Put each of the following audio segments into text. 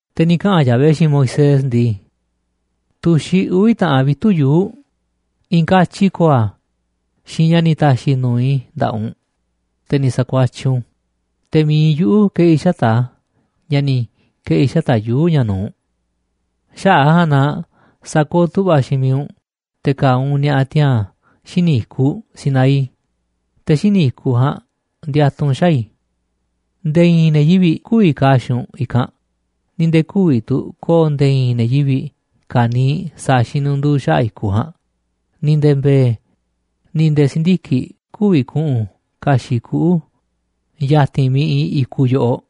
Te̱ ni̱ kaꞌa̱n Yahvé xiinꞌ Moisés ndii: ―Tu̱xiꞌ uvi̱ taꞌan vitu̱ꞌ yuu̱ꞌ, i̱i̱n katyi ko̱o̱ a̱ xiinꞌ ña̱ ni̱ ta̱xi̱ i̱ nu̱uꞌ i̱ nda̱ꞌaꞌ u̱nꞌ, te̱ ni̱ sa̱kuatyiꞌ u̱nꞌ u̱n, te̱ mi̱iꞌ yuꞌu̱ ke̱ꞌi̱ xata̱ꞌ a̱ ña̱ ni̱ ke̱ꞌi̱ xata̱ꞌ yuu̱ꞌ ña̱ nu̱uꞌ. Xaꞌa̱ꞌ a̱ ja̱a̱nꞌ na sa̱kooꞌ tu̱ꞌva̱ xiinꞌ miiꞌ u̱nꞌ te̱ ka̱a̱ u̱nꞌ ni̱a̱ꞌa̱ tiaa̱n xíniꞌ i̱kuꞌ Sinaí, te̱ xíniꞌ i̱kuꞌ ja̱a̱nꞌ ndiatuꞌ u̱nꞌ xaa̱ i̱. Nde̱e̱ i̱i̱n ne̱ yivi̱ꞌ kü̱vi̱ ka̱a̱ xiinꞌ u̱nꞌ i̱kanꞌ, ni̱ nde̱e̱ kü̱vi̱ tu̱ ko̱o̱ nde̱e̱ i̱i̱n ne̱ yivi̱ꞌ ka̱niiꞌ sa̱a̱ xinunduu xaꞌa̱ꞌ i̱kuꞌ ja̱a̱nꞌ, ni̱ nde̱e̱ mbe̱e̱, ni̱ nde̱e̱ si̱ndiki̱ꞌ kü̱vi̱ ku̱ꞌu̱n ka̱xi̱ꞌ kuꞌu̱ ya̱ti̱n miiꞌ iinꞌ i̱kuꞌ yoꞌoꞌ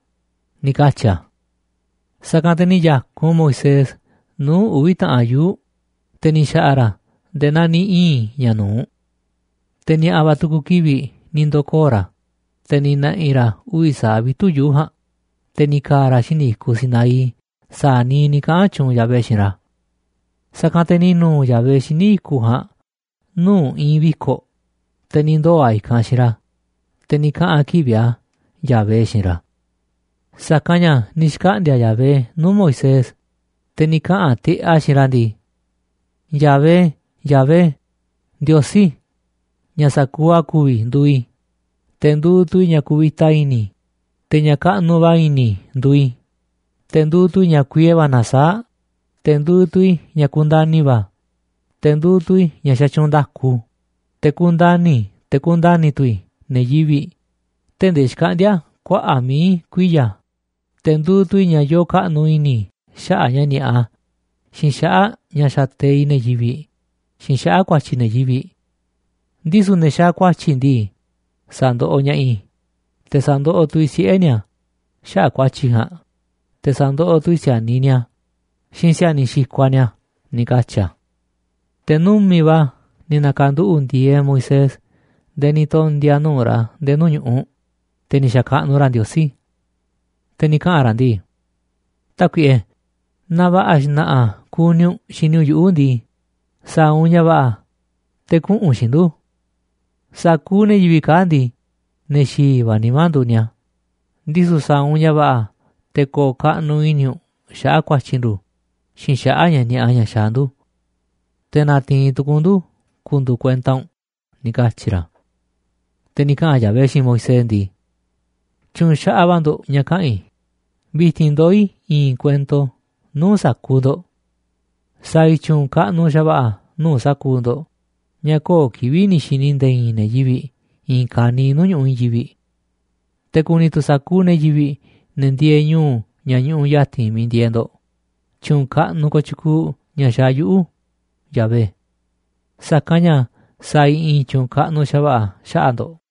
―ni̱ katyi̱ a̱. Sa̱kanꞌ te̱ ni̱ ya̱kun Moisés nuu̱ꞌ uvi̱ taꞌan yuu̱ꞌ, te̱ ni̱ xa̱ꞌa̱ ra̱ a̱ nde̱e̱ naa ni̱ ii̱n ña̱ nu̱uꞌ. Te̱ ni̱a̱ꞌa̱ va̱ tu̱ku̱ kivi̱ꞌ ni̱ ndo̱koo̱ ra̱, te̱ ni̱ na̱ꞌi̱ ra̱ uvi̱ sa̱aꞌ vitu̱ꞌ yuu̱ꞌ ja̱a̱nꞌ, te̱ ni̱ ka̱a̱ ra̱ xíniꞌ i̱kuꞌ Sinaí sa̱a̱ niiꞌ ni̱ kaꞌa̱n tyuunꞌ Yahvé xiinꞌ ra̱. Sa̱kanꞌ te̱ ni̱ nu̱u̱ Yahvé xíniꞌ i̱kuꞌ ja̱a̱nꞌ nuu̱ꞌ i̱i̱n viko̱ꞌ, te̱ ni̱ ndoo̱ a̱ i̱kanꞌ xiinꞌ ra̱, te̱ ni̱ kaꞌa̱n a̱ kivi̱ꞌ a̱, Yahvé, xiinꞌ ra̱. Sa̱kanꞌ ña̱ ni̱ xkaꞌndi̱a̱ Yahvé nuu̱ꞌ Moisés, te̱ ni̱ kaꞌa̱n tiꞌeꞌ a̱ xiinꞌ ra̱ ndii: ―¡Yahvé, Yahvé, Ndiosí ña̱ sa̱kuuꞌ a̱ ku̱vi̱ nduuꞌ i̱! Te̱ nduuꞌ tu̱ i̱ ña̱ kuvita i̱ni̱, te̱ ña̱ kaꞌnuꞌ va̱ i̱ni̱ nduuꞌ i̱, te̱ nduuꞌ tu̱ i̱ ña̱ kuiee va̱ nasaáꞌ, te̱ nduuꞌ tu̱ i̱ ña̱ kundani̱ va̱, te̱ nduuꞌ tu̱ i̱ ña̱ xatyuunꞌ nda̱ku. Te̱ kundani̱ te̱ kundani̱ tu̱ i̱ ne̱ yivi̱ꞌ tee̱ꞌ ndee xkaꞌndi̱a̱ kuaꞌa̱ꞌ mií kuiya̱, te̱ nduuꞌ tu̱ i̱ ña̱ yoo kaꞌnuꞌ i̱ni̱ xaꞌa̱ꞌ ña̱ ni̱a̱ꞌa, xiinꞌ xaꞌa̱ꞌ ña̱ xateiꞌ ne̱ yivi̱ꞌ, xiinꞌ xaꞌa̱ꞌ ku̱a̱tyi̱ ne̱ yivi̱ꞌ. Ndisu̱ ne̱ xaaꞌ ku̱a̱tyi̱ ndii, sa̱ndoꞌoꞌ ña̱ꞌaꞌ i̱, te̱ sa̱ndoꞌoꞌ tu̱ i̱ siꞌe̱ ni̱a̱ xaꞌa̱ꞌ ku̱a̱tyi̱ ja̱a̱nꞌ, te̱ sa̱ndoꞌoꞌ tu̱ i̱ si̱a̱niꞌ ni̱a̱ xiinꞌ si̱a̱niꞌ xikuaꞌ ni̱a̱ ―ni̱ katyi̱ a̱. Te̱ numi̱ꞌ va̱ ni̱ na̱ka̱nduꞌu̱ꞌ ndi̱e̱e̱ Moisés nde̱e̱ ni̱ tondi̱a̱ nuu̱ꞌ ra̱ nde̱e̱ nuu̱ꞌ ñu̱ꞌuꞌ, te̱ ni̱ xa̱kaꞌnuꞌ ra̱ Ndiosí. Te̱ ni̱ kaꞌa̱n ra̱ ndii: ―Tákuiꞌe, naaꞌ va̱ꞌa̱ xna̱ꞌa̱ kuni u̱nꞌ xini u̱nꞌ yuꞌu̱ ndii, sa̱a̱ u̱nꞌ ña̱ va̱ꞌa̱ te̱ kuꞌu̱n u̱nꞌ xiinꞌ ndu̱. Sa̱kuuꞌ ne̱ yivi̱ꞌ kaa̱ꞌ ndii, ne̱ xi̱i̱ va̱ nimá nduuꞌ ni̱a̱, ndisu̱ sa̱a̱ u̱nꞌ ña̱ va̱ꞌa̱ te̱ ko̱o̱ kaꞌnuꞌ i̱ni̱ u̱nꞌ xaꞌa̱ꞌ ku̱a̱tyi̱ ndu̱ xiinꞌ xaꞌa̱ꞌ ña̱ ni̱a̱ꞌa ña̱ xaaꞌ ndu̱. Te̱ na̱ti̱i̱n tu̱ku̱u̱ u̱nꞌ ndu̱ ku̱ndu̱u̱ kuenta u̱nꞌ ―ni̱ katyi̱ ra̱. Te̱ ni̱ kaꞌa̱n Yahvé xiinꞌ Moisés ndii: ―Tyu̱u̱n xaꞌaꞌ va̱ ndo̱ꞌ ña̱ kaꞌa̱n i̱, vi̱ti̱n ndoó i̱ i̱i̱n kuento nuu̱ꞌ sa̱kuuꞌ ndo̱ꞌ. Sa̱a̱ i̱ tyu̱u̱n kaꞌnuꞌ xa̱va̱ꞌa̱ nuu̱ꞌ sa̱kuuꞌ ndo̱ꞌ ña̱ köo̱ꞌ kivi̱ꞌ ni̱ xi̱ni̱ nde̱e̱ i̱i̱n ne̱ yivi̱ꞌ i̱i̱n ka̱niiꞌ nuu̱ꞌ ñu̱ꞌuꞌ i̱i̱n yivi̱ꞌ. Te̱ ku̱ni̱ tu̱ sa̱kuuꞌ ne̱ yivi̱ꞌ, ne̱ ndieeꞌ ñu̱u̱ ña̱ ñuꞌuꞌ ya̱ti̱n miiꞌ ndieeꞌ ndo̱ꞌ tyu̱u̱n kaꞌnuꞌ kooꞌ tyukuuꞌ ña̱ xaaꞌ yuꞌu̱, Yahvé. Sa̱kanꞌ ña̱ sa̱a̱ i̱ i̱i̱n tyu̱u̱n kaꞌnuꞌ xa̱va̱ꞌa̱ xaꞌa̱ꞌ ndo̱ꞌ.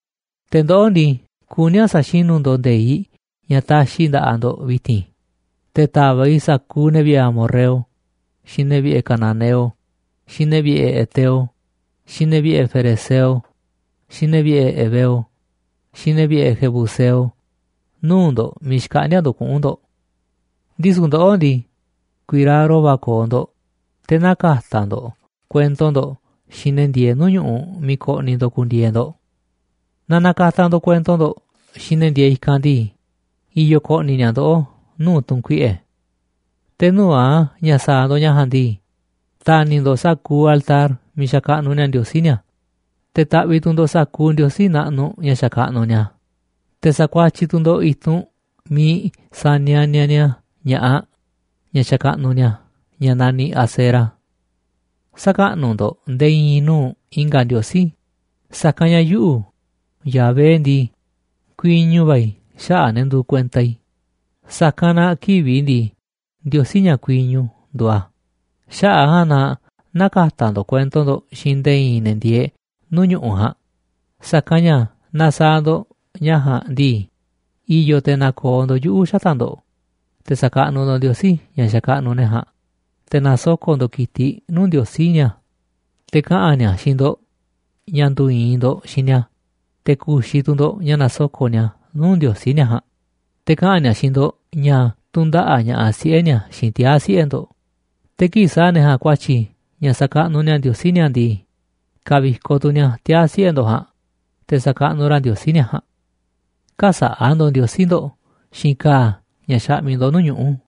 ’Te̱ ndoꞌó ndii, kuní a̱ sa̱xinu̱ ndo̱ꞌ nde̱iꞌ ña̱ taxiꞌ i̱ nda̱ꞌaꞌ ndo̱ꞌ vi̱ti̱n, te̱ ta̱va̱ꞌ i̱ sa̱kuuꞌ ne̱ vi̱ꞌe̱ amorreo, xiinꞌ ne̱ vi̱ꞌe̱ cananeo, xiinꞌ ne̱ vi̱ꞌe̱ heteo, xiinꞌ ne̱ vi̱ꞌe̱ ferezeo, xiinꞌ ne̱ vi̱ꞌe̱ heveo, xiinꞌ ne̱ vi̱ꞌe̱ jebuseo nuu̱ꞌ ndo̱ꞌ miiꞌ xkaꞌndi̱a̱ ndo̱ꞌ kuꞌu̱n ndo̱ꞌ. Ndisu̱ ndoꞌó ndii, ku̱i̱raro va̱ ko̱o̱ ndo̱ꞌ te̱ nä̱ka̱ta̱ ndo̱ꞌ kuento ndo̱ꞌ xiinꞌ ne̱ ndieeꞌ nuu̱ꞌ ñu̱ꞌuꞌ miiꞌ ko̱ꞌni̱ ndo̱ꞌ ku̱ndi̱e̱e̱ ndo̱ꞌ. Naaꞌ na̱ka̱ta̱ ndo̱ꞌ kuento ndo̱ꞌ xiinꞌ ne̱ ndieeꞌ i̱kanꞌ ndii, i̱yo̱ ko̱ꞌni̱ ni̱a̱ ndoꞌó nuu̱ꞌ tu̱n kuiꞌe̱. Te̱ nuu̱ꞌ a̱ ña̱ sa̱a̱ ndo̱ꞌ ña̱ ja̱a̱nꞌ ndii, ta̱ni̱ ndo̱ꞌ sa̱kuuꞌ altar miiꞌ xakaꞌnuꞌ ni̱a̱ ndiosí ni̱a̱, te̱ ta̱ꞌviꞌ tu̱ ndo̱ꞌ sa̱kuuꞌ ndiosí naꞌnuꞌ ña̱ xakaꞌnuꞌ ni̱a̱, te̱ sa̱kuatyiꞌ tu̱ ndo̱ꞌ i̱tunꞌ miiꞌ sanianiaꞌ ni̱a̱ ña̱ꞌaꞌ, ñaꞌ xakaꞌnuꞌ ni̱a̱ ñaꞌ naniꞌ Asera. Sä̱kaꞌnuꞌ ndo̱ꞌ nde̱e̱ i̱i̱n nuu̱ꞌ i̱nga̱ ndiosí, sa̱kanꞌ ña̱ yuꞌu̱, Yahvé ndii, kuiñu va̱ i̱ xaꞌa̱ꞌ ne̱ nduuꞌ kuenta i̱, sa̱kanꞌ na kivi̱ꞌ i̱ ndii, Ndiosí ña̱ kuiñu nduuꞌ a̱. ’Xaꞌa̱ꞌ a̱ ja̱a̱nꞌ na nä̱ka̱ta̱ ndo̱ꞌ kuento ndo̱ꞌ xiinꞌ nde̱e̱ i̱i̱n ne̱ ndieeꞌ nuu̱ꞌ ñu̱ꞌuꞌ ja̱a̱nꞌ, sa̱kanꞌ ña̱ naaꞌ sa̱a̱ ndo̱ꞌ ña̱ ja̱a̱nꞌ ndii, i̱yo̱ te̱ na̱ko̱o̱ ndo̱ꞌ yuꞌu̱ xata̱ꞌ ndo̱ꞌ, te̱ sa̱kaꞌnuꞌ ndo̱ꞌ ndiosí ña̱ xakaꞌnuꞌ ne̱ ja̱a̱nꞌ, te̱ na̱soko̱ꞌ ndo̱ꞌ ki̱tiꞌ nuu̱ꞌ ndiosí ni̱a̱, te̱ kaꞌa̱n ni̱a̱ xiinꞌ ndo̱ꞌ ña̱ ndu̱u̱ i̱i̱n ndo̱ꞌ xiinꞌ ni̱a̱ te̱ ku̱xi̱ tu̱ ndo̱ꞌ ña̱ nasoko̱ꞌ ni̱a̱ nuu̱ꞌ ndiosí ni̱a̱ ja̱a̱nꞌ, te̱ kaꞌa̱n ni̱a̱ xiinꞌ ndo̱ꞌ ña̱ tu̱ndaꞌa̱ꞌ ña̱ꞌaꞌ siꞌe̱ ni̱a̱ xiinꞌ tiaa̱ siꞌe̱ ndo̱ꞌ, te̱ kii̱ꞌ sa̱a̱ ne̱ ja̱a̱nꞌ ku̱a̱tyi̱ ña̱ sa̱kaꞌnuꞌ ni̱a̱ ndiosí ni̱a̱ ndii, ka̱vi̱koꞌ tu̱ ni̱a̱ tiaa̱ siꞌe̱ ndo̱ꞌ ja̱a̱nꞌ te̱ sa̱kaꞌnuꞌ ra̱ ndiosí ni̱a̱ ja̱a̱nꞌ. Kä̱sa̱ꞌa̱ ndo̱ꞌ ndiosí ndo̱ꞌ xiinꞌ ka̱a̱ ña̱ xaꞌmiꞌ ndo̱ꞌ nuu̱ꞌ ñuꞌu̱.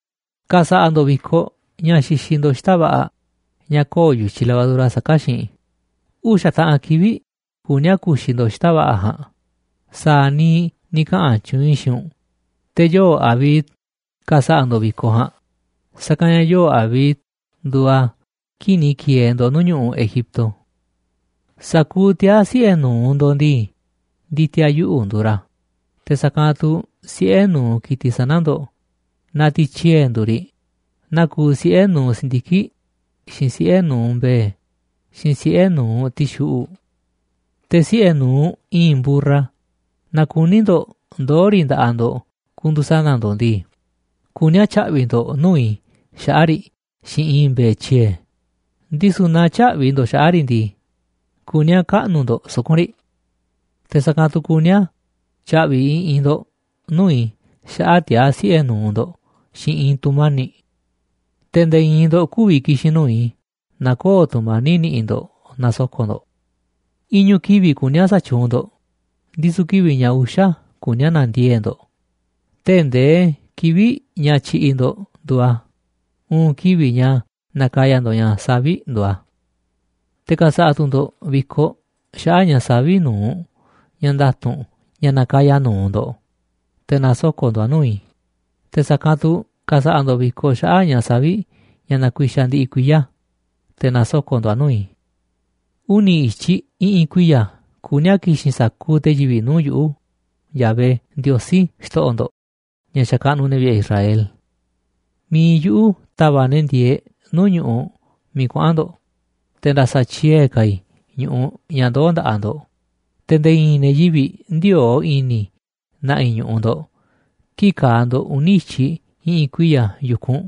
’Ka̱sa̱ꞌa̱ ndo̱ꞌ vi̱koꞌ ña̱ xixiꞌ ndo̱ꞌ xita̱ꞌ va̱ꞌa̱ ña̱ köo̱ꞌ yu̱tyiꞌ levadura saká xiinꞌ. Uxa̱ taꞌan kivi̱ꞌ kuní a̱ ku̱xi̱ ndo̱ꞌ xita̱ꞌ va̱ꞌa̱ ja̱a̱nꞌ sa̱a̱ niiꞌ ni̱ kaꞌa̱n tyuunꞌ i̱ xiinꞌ u̱nꞌ. Te̱ yoo̱ Abib ka̱sa̱ꞌa̱ ndo̱ꞌ vi̱koꞌ ja̱a̱nꞌ, sa̱kanꞌ ña̱ yoo̱ꞌ Abib nduuꞌ a̱ kii̱ꞌ ni̱ ki̱e̱e̱ ndo̱ꞌ nuu̱ꞌ ñu̱ꞌuꞌ Egipto. Sa̱kuuꞌ tiaa̱ siꞌe̱ nu̱uꞌ ndo̱ꞌ ndii, ndi̱ti̱a̱ yuꞌu̱ nduuꞌ ra̱, te̱ sa̱kanꞌ tu̱ siꞌe̱ nu̱uꞌ ki̱tiꞌ sana̱ ndo̱ꞌ naaꞌ tiꞌ tyiee̱ nduuꞌ riꞌ, naa kuuꞌ siꞌe̱ nu̱uꞌ si̱ndiki̱ꞌ, xiinꞌ siꞌe̱ nu̱uꞌ mbe̱e̱, xiinꞌ siꞌe̱ nu̱uꞌ ti̱xuꞌu̱ꞌ. Te̱ siꞌe̱ nu̱uꞌ i̱i̱n mburra naaꞌ kuní ndo̱ꞌ ndoo̱ riꞌ nda̱ꞌaꞌ ndo̱ꞌ ku̱ndu̱u̱ sana̱ ndo̱ꞌ ndii, kuní a̱ tya̱ꞌvi̱ ndo̱ꞌ nuu̱ꞌ i̱ xaꞌa̱ꞌ riꞌ xiinꞌ i̱i̱n mbe̱e̱ tyiee̱. Ndisu̱ naaꞌ tyä̱ꞌvi̱ ndo̱ꞌ xaꞌa̱ꞌ riꞌ ndii, kuní a̱ kaꞌnu̱ ndo̱ꞌ suku̱nꞌ riꞌ. Te̱ sa̱kanꞌ tu̱ kuní a̱ tya̱ꞌvi̱ i̱ꞌi̱n ndo̱ꞌ nuu̱ꞌ i̱ xaꞌa̱ꞌ tiaa̱ siꞌe̱ nu̱uꞌ ndo̱ꞌ xiinꞌ i̱i̱n tu̱mani̱ꞌ. Te̱ nde̱e̱ i̱i̱n ndo̱ꞌ kü̱vi̱ ki̱xi̱n nuu̱ꞌ i̱ naaꞌ köo̱ꞌ tu̱mani̱ꞌ niꞌiꞌ ndo̱ꞌ na̱soko̱ꞌ ndo̱ꞌ. Iñu̱ kivi̱ꞌ kuní a̱ sa̱tyuunꞌ ndo̱ꞌ, ndisu̱ kivi̱ꞌ ña̱ uxa̱ kuní a̱ na̱ndiee̱ꞌ ndo̱ꞌ tee̱ꞌ ndee kivi̱ꞌ ña̱ tyiꞌiꞌ ndo̱ꞌ nduuꞌ a̱, uun kivi̱ꞌ ña̱ nakaya ndo̱ꞌ ña̱ savi̱ꞌ nduuꞌ a̱. Te̱ ka̱sa̱ꞌa̱ tu̱ ndo̱ꞌ vi̱koꞌ xaꞌa̱ꞌ ña̱ savi̱ꞌ nu̱uꞌ ña̱ nda̱tu̱nꞌ ña̱ nakaya nu̱uꞌ ndo̱ꞌ, te̱ na̱soko̱ꞌ ndo̱ꞌ a̱ nuu̱ꞌ i̱, te̱ sa̱kanꞌ tu̱ ka̱sa̱ꞌa̱ ndo̱ꞌ vi̱koꞌ xaꞌa̱ꞌ ña̱ savi̱ꞌ ña̱ nakuixaꞌ ndiꞌiꞌ kuiya̱, te̱ na̱soko̱ꞌ ndo̱ꞌ a̱ nuu̱ꞌ i̱. Uni̱ i̱tyiꞌ i̱ꞌi̱n kuiya̱ kuní a̱ ki̱xi̱n sa̱kuuꞌ te̱ yivi̱ꞌ nuu̱ꞌ yuꞌu̱, Yahvé, Ndiosí, xto̱ꞌo̱ ndo̱ꞌ, ña̱ xakaꞌnuꞌ ne̱ vi̱ꞌe̱ Israel. Mi̱iꞌ yuꞌu̱ ta̱va̱ꞌ ne̱ ndieeꞌ nuu̱ꞌ ñu̱ꞌuꞌ miiꞌ kuaꞌa̱n ndo̱ꞌ, te̱ nda̱sa̱tyiee̱ ka̱ i̱ ñu̱ꞌuꞌ ña̱ ndoo̱ nda̱ꞌaꞌ ndo̱ꞌ, te̱ nde̱e̱ i̱i̱n ne̱ yivi̱ꞌ ndï̱o̱o̱ꞌ i̱ni̱ na̱ꞌi̱ ñu̱ꞌuꞌ ndo̱ꞌ kii̱ꞌ ka̱a̱ ndo̱ꞌ uni̱ i̱tyiꞌ i̱ꞌi̱n kuiya̱ yu̱kunꞌ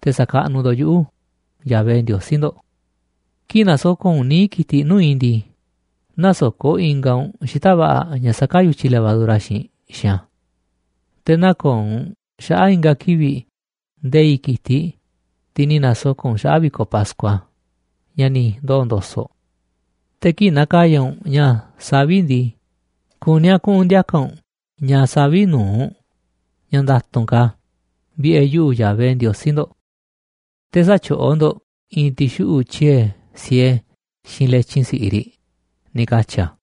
te̱ sa̱kaꞌnuꞌ ndo̱ꞌ yuꞌu̱, Yahvé, Ndiosí ndo̱ꞌ. ’Kii̱ꞌ na̱soko̱ꞌ u̱nꞌ níiꞌ ki̱tiꞌ nuu̱ꞌ i̱ ndii, nä̱soko̱ꞌ ingaꞌ u̱nꞌ xita̱ꞌ va̱ꞌa̱ ña̱ saká yu̱tyiꞌ levadura xiinꞌ xiinꞌ a̱. Te̱ nä̱ko̱o̱ u̱nꞌ xaꞌa̱ꞌ i̱nga̱ kivi̱ꞌ nde̱i̱ꞌ ki̱tiꞌ, tiꞌ ni̱ na̱soko̱ꞌ u̱nꞌ xaꞌa̱ꞌ vi̱koꞌ pascua, ña̱ ni̱ ndoo̱ ndo̱so̱ꞌ. Te̱ kii̱ꞌ na̱ka̱ya̱ u̱nꞌ ña̱ savi̱ꞌ ndii, kuní a̱ kuꞌu̱n ndi̱a̱ka̱ u̱nꞌ ña̱ savi̱ꞌ nu̱uꞌ, ña̱ nda̱tu̱nꞌ ka̱, vi̱ꞌe̱ yuꞌu̱, Yahvé Ndiosí. Te̱ sä̱tyoꞌó ndo̱ꞌ i̱i̱n ti̱xuꞌu̱ꞌ tyiee̱ siee xiinꞌ letyin si̱ꞌiꞌ riꞌ ―ni̱ katyi̱ a̱.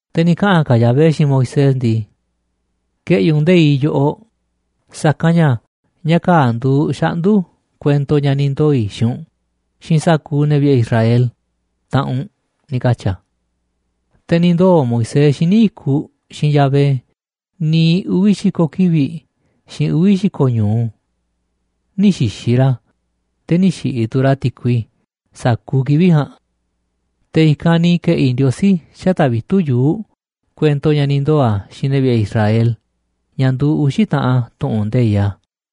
Te̱ ni̱ kaꞌa̱n ka̱ Yahvé xiinꞌ Moisés ndii: ―Ke̱ꞌi̱ u̱nꞌ nde̱iꞌ yoꞌoꞌ, sa̱kanꞌ ña̱ ña̱ kaa̱ꞌ nduuꞌ xaꞌndu̱ kuento ña̱ ni̱ ndoo̱ i̱ xiinꞌ u̱nꞌ xiinꞌ sa̱kuuꞌ ne̱ vi̱ꞌe̱ Israel, taꞌanꞌ u̱nꞌ ―ni̱ katyi̱ a̱. Te̱ ni̱ ndoo̱ Moisés xíniꞌ i̱kuꞌ xiinꞌ Yahvé niiꞌ uvi̱ xi̱ko̱ kivi̱ꞌ xiinꞌ uvi̱ xi̱ko̱ ñu̱u. Nï̱ xi̱xi̱ ra̱, te̱ nï̱ xi̱ꞌi̱ tu̱ ra̱ ti̱kui sa̱kuuꞌ kivi̱ꞌ ja̱a̱nꞌ. Te̱ i̱kanꞌ ni̱ ke̱ꞌi̱ Ndiosí xata̱ꞌ vitu̱ꞌ yuu̱ꞌ kuento ña̱ ni̱ ndoo̱ a̱ xiinꞌ ne̱ vi̱ꞌe̱ Israel, ña̱ nduuꞌ uxi̱ taꞌan tu̱ꞌu̱n nde̱iꞌ a̱.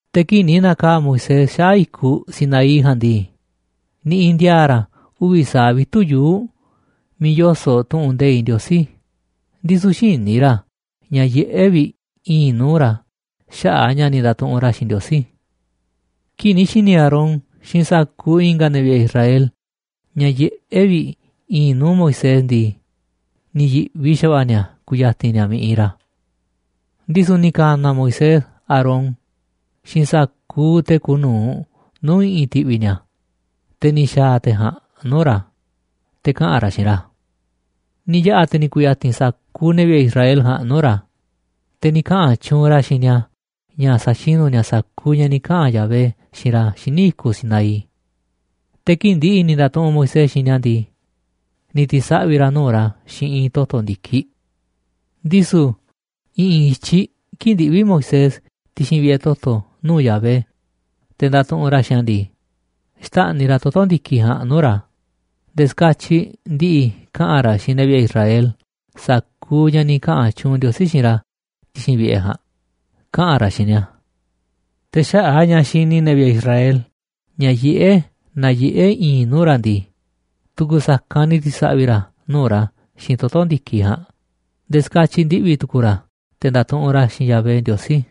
Te̱ kii̱ꞌ ni̱ na̱kaa̱ꞌ Moisés xaꞌa̱ꞌ i̱kuꞌ Sinaí ja̱a̱nꞌ ndii, niꞌiꞌ ndi̱a̱a̱ ra̱ uvi̱ sa̱aꞌ vitu̱ꞌ yuu̱ꞌ miiꞌ yoso̱ꞌ tu̱ꞌu̱n nde̱iꞌ Ndiosí, ndisu̱ xïní ra̱ ña̱ yiꞌé vi̱ꞌ i̱i̱nꞌ nuu̱ꞌ ra̱ xaꞌa̱ꞌ ña̱ ni̱ ndatuꞌunꞌ ra̱ xiinꞌ Ndiosí. Kii̱ꞌ ni̱ xi̱ni̱ Aarón xiinꞌ sa̱kuuꞌ i̱nga̱ ne̱ vi̱ꞌe̱ Israel ña̱ yiꞌé vi̱ꞌ i̱i̱nꞌ nuu̱ꞌ Moisés ndii, ni̱ yi̱ꞌvi xa̱va̱ꞌa̱ ni̱a̱ ku̱ya̱ti̱n ni̱a̱ miiꞌ iinꞌ ra̱. Ndisu̱ ni̱ ka̱na̱ Moisés Aarón xiinꞌ sa̱kuuꞌ te̱ kuuꞌ nu̱uꞌ nuu̱ꞌ i̱ꞌi̱n ti̱ꞌvi̱ ni̱a̱, te̱ ni̱ xaa̱ te̱ ja̱a̱nꞌ nuu̱ꞌ ra̱, te̱ kaꞌa̱n ra̱ xiinꞌ ra̱. Ni̱ yaꞌa̱ te̱ ni̱ ku̱ya̱ti̱n sa̱kuuꞌ ne̱ vi̱ꞌe̱ Israel ja̱a̱nꞌ nuu̱ꞌ ra̱, te̱ ni̱ kaꞌa̱n tyuunꞌ ra̱ xiinꞌ ni̱a̱ ña̱ sa̱xinu̱ ni̱a̱ sa̱kuuꞌ ña̱ ni̱ kaꞌa̱n Yahvé xiinꞌ ra̱ xíniꞌ i̱kuꞌ Sinaí. Te̱ kii̱ꞌ ndi̱ꞌi̱ ni̱ nda̱tuꞌunꞌ Moisés xiinꞌ ni̱a̱ ndii, ni̱ ti̱saꞌvi̱ ra̱ nuu̱ꞌ ra̱ xiinꞌ i̱i̱n toto̱ ndi̱kiꞌ. Ndisu̱ i̱ꞌi̱n i̱tyiꞌ kii̱ꞌ ndiꞌví Moisés ti̱xi̱n vi̱ꞌe̱ toto̱ nuu̱ꞌ Yahvé, te̱ nda̱tuꞌunꞌ ra̱ xiinꞌ a̱ ndii, xtáꞌniꞌ ra̱ toto̱ ndi̱kiꞌ ja̱a̱nꞌ nuu̱ꞌ ra̱, nde̱e̱ ska̱tyiꞌ ndi̱ꞌi̱ kaꞌa̱n ra̱ xiinꞌ ne̱ vi̱ꞌe̱ Israel sa̱kuuꞌ ña̱ ni̱ kaꞌa̱n tyuunꞌ Ndiosí xiinꞌ ra̱ ti̱xi̱n vi̱ꞌe̱ ja̱a̱nꞌ, kaꞌa̱n ra̱ xiinꞌ ni̱a̱. Te̱ xaꞌa̱ꞌ a̱ ña̱ xini ne̱ vi̱ꞌe̱ Israel ña̱ yiꞌé naa yiꞌé i̱i̱nꞌ nuu̱ꞌ ra̱ ndii, tu̱ku̱ sa̱kanꞌ ni̱ ti̱saꞌvi̱ ra̱ nuu̱ꞌ ra̱ xiinꞌ toto̱ ndi̱kiꞌ ja̱a̱nꞌ nde̱e̱ ska̱tyiꞌ ndiꞌvi̱ tu̱ku̱u̱ ra̱ te̱ ndatuꞌunꞌ ra̱ xiinꞌ Yahvé Ndiosí.